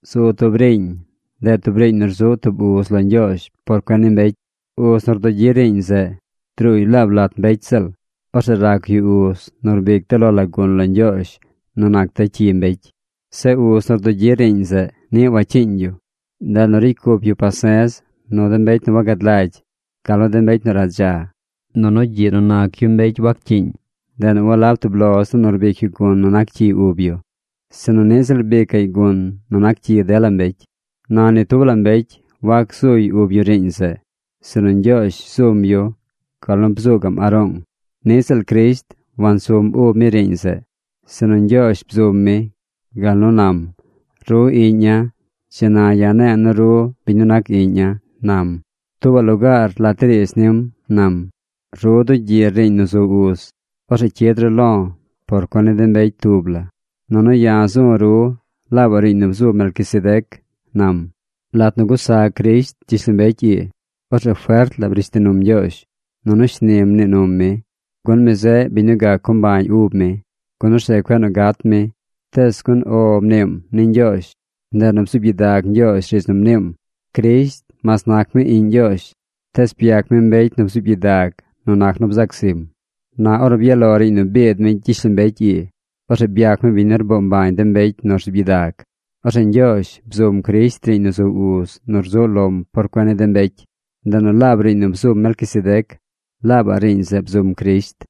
Zu tub riiñ. Ndeꞌ tub riiñ nu rzuꞌ tub uz lo Ñgyoozh por cuen ni mbecy. Uz nu rdugyi riiñ zeꞌ druuy laab lat mbecy ziꞌl. Orzeꞌ rac yu uz nu rbic de lo la gun lo Ñgyoozh nu nac de cyi mbecy. Zeꞌ uz nu rdugyi riiñ zeꞌ niꞌ wacyiiñ yu. Ndeꞌ nu ricy cup yu pase̱z nu de mbecy nu wagad lagy, gal nu de mbecy nu radza. Nunu gyiꞌ nu nac yu mbecy waccyiiñ, ndeꞌ nu walab tub lo ziꞌl nu rbic yu gun nu nac cyi ub yu, sinu niꞌ ziꞌl rbicaꞌy gun nu nac cyi dela mbecy. Na ni tub la mbecy wac gzuy ub yu riiñ zeꞌ, sinu Ñgyoozh zum yu gal nu bzuu gaꞌm Aroong. Niꞌ ziꞌl Crisht wansum ub mi riiñ zeꞌ, sinu Ñgyoozh bzum mi gal nu nam: Ru Iꞌña̱. Dzi na ya̱ ne̱e̱ nu ru biñ nu nac Iꞌña̱, nam. Tuubaꞌ lugaar lat de riidz nim nam: Ru dugyir riiñ nu zu uz. Orzeꞌ cyid ru lo̱ por cuen ni de mbecy tub la. Nunu ya̱ zu̱ ru laabaꞌ riiñ nu bzu̱ Melquisedec, nam. Lat nu gusa Crisht gyishlombecy ii, orzeꞌ fert la brish ti num Ñgyoozh nunu shni mnii num mi, gun mi zeꞌ biñ nu gac co mbañ ub mi, gun orzeꞌ cueꞌ nu gat mi. Tees gun “O” mniim ni Ñgyoozh, ndeꞌ nu bzuub gyidag Ñgyoozh riidz nu mniim. Crisht, mas nac mi Iꞌñ Ñgyoozh, tees byac mi mbecy nu bzuub gyidag nu nac nu bzac zim. Na ornu byaꞌ lo riiñ nu biid mi gyishlombecy ii, orzeꞌ byac mi biñ nu rboo mbañ de mbecy nu rzuub gyidag. Orzeꞌ Ñgyoozh bzum Crisht riiñ nu zu uz nu rzuꞌ lom por cuen ni de mbecy. Ndeꞌ nu laab riiñ nu bzum Melquisedec, laabaꞌ riiñ zeꞌ bzum Crisht.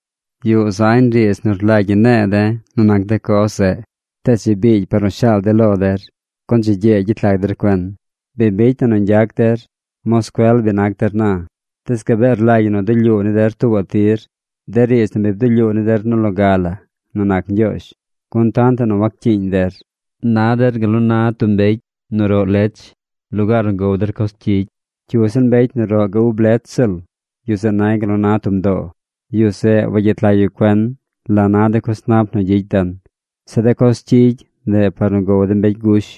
Yuꞌ zañ riidz nu rlagy ñi ne̱e̱ de̱ nu nac de coz zeꞌ. Tees dzi biigy par nu shaal de̱ lo der, gun dzi gyee gyet lag der cuen. Bi bicy na nu ñgyac der, bi nac der moscuel na, tees gabee rlagy ñi nu dulyuu ni der tuubaꞌ tir de riidz nu bi bdulyuu ni der nu loga la nu nac Ñgyoozh, gun tantaꞌ nu waccyiiñ der. Na der gal nu na tub mbecy nu roꞌ lech lugaar nu gow der coz cyigy. Cyu ziꞌl mbecy nu roꞌ ga ub lech ziꞌl, yu zeꞌ nay gal nu na tub mdoo. Yu zeꞌ wagyet lag yu cuen la na de coz nap nu gyicy den. Zeꞌ de coz cyigy, ndeꞌ par nu gow de mbecy gush.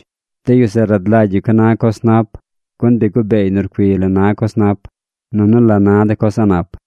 De yu zeꞌ rad lagy yu ca na coz nap, gun bi gubeey nu rcuiy la na coz nap, nunu la na de coz a̱ꞌ nap.